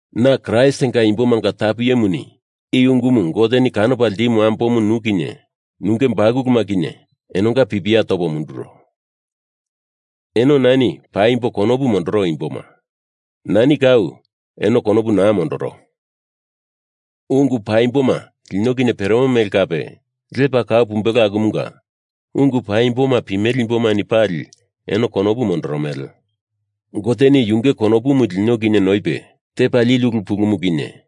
Na Kraistinga imbomanga tapu iyemuni i ungumu Goteni kanopa ltimu ambomu nu kinye nunge bakuluma kinye enonga pipia topo munduro. Eno nani paimbo konopu mondoro imboma. Nani kau eno konopu naa mondoro. Ungu paimboma lino kinye peremo mele kape lepa kau pumbelo akumunga ungu paimboma pimele imbomani pali eno konopu mondoromele. Goteni yunge konopumu lino kinye noipe tepa lili ulu pulumu kinye,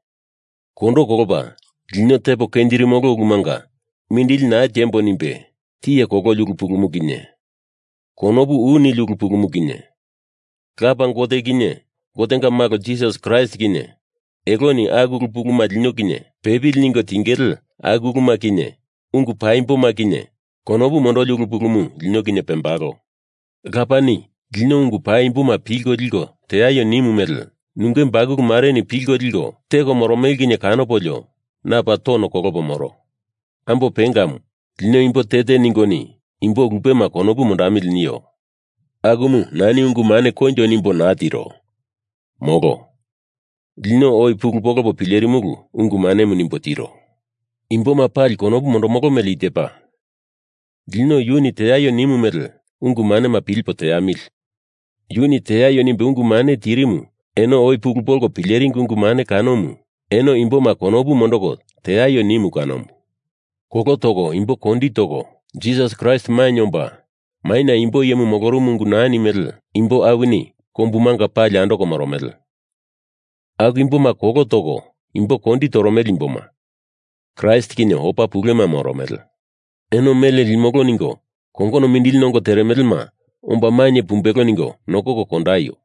kondo kolopa lino tepo kenjirimolo ulumanga mindili naa tiembo nimbe tiye kololi ulu pulumu kinye, konopu u nili ulu pulumu kinye, Lapa Gote kinye Gotenga Malo Jisasi Kraist kinye eloni aku ulu puluma lino kinye pepili ningo tingele, aku uluma kinye ungu paimbomu kinye konopu mondoli ulu pulumu lino kinye pembalo. Lapani lino ungu paimboma pilko liko teaio nimu mele nunge bakulu mareni pilko liko teko moromele kinye kanopolio na paa tono kolopo moro. Ambo pengamu, lino imbo te te ningoni imbo lupema konopu mondamili nio, akumu nani ungu mane koinjo nimbo naa tiro, molo. Lino oi pulu polopo pilerimulu ungu manemu nimbo tiro. Imboma pali konopu mondomolo mele i tepa: Lino yuni teaio nimu mele ungu manema pilipo teamili! Yuni teaio nimbe ungu mane tirimu eno oi pulu polko pileringi ungu mane kanomu eno imboma konopu mondoko teaio nimu kanomu. Kolo toko imbo kondi toko, Jisasi Kraist mainye omba maina imbo iyemu molorumu ungu naa nimele imbo awini kombumanga pali andoko moromele. Aku imboma kolo toko imbo kondi toromele imboma Kraist kinye opa pulema moromele. Eno mele limolo ningo kongono mindili nongo teremelema omba mainye pumbelo ningo nokoko kondaio!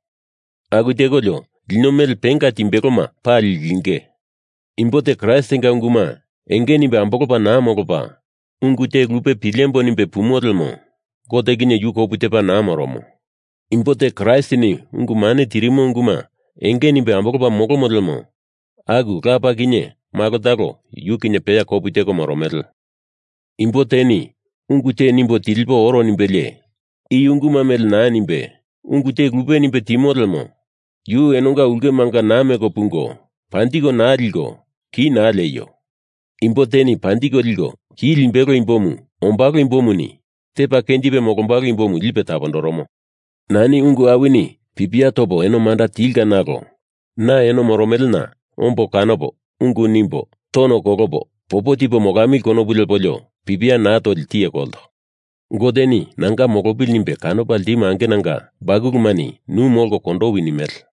Aku tekolio lino mele penga timbeloma pali linge. Imbo te Kraistinga unguma enge nimbe ambolopa naa molopa, ungu te lupe pilembo nimbe pumo lemo Gote kinye yu kopu tepa naa moromo. Imbo te Kraistini ungu mane tirimo unguma enge nimbe ambolopa molomo lemo aku Lapa kinye Malo talo yu kinye peya kopu teko moromele. Imbo teni ungu te nimbo tilipo oro nimbelie i unguma mele naa nimbe ungu te lupe nimbe timo lemo yu enonga ulkemanga naa meko pungo, panjiko naa liko ki naa lieio! Imbo teni panjiko liko ki limbelo imbomu ombalo imbomuni tepa kenjipe molombalo imbomu lipe tapondoromo. Nani ungu awini pipia topo eno manda tilka nalo na eno moromelena ombo kanopo ungu nimbo tono kolopo popo tipo molamili konopu lepolio pipia naa toli tiye kolto. Goteni nanga molopili nimbe kanopa ltimu angenanga bakulumani nu molko kondowi nimele.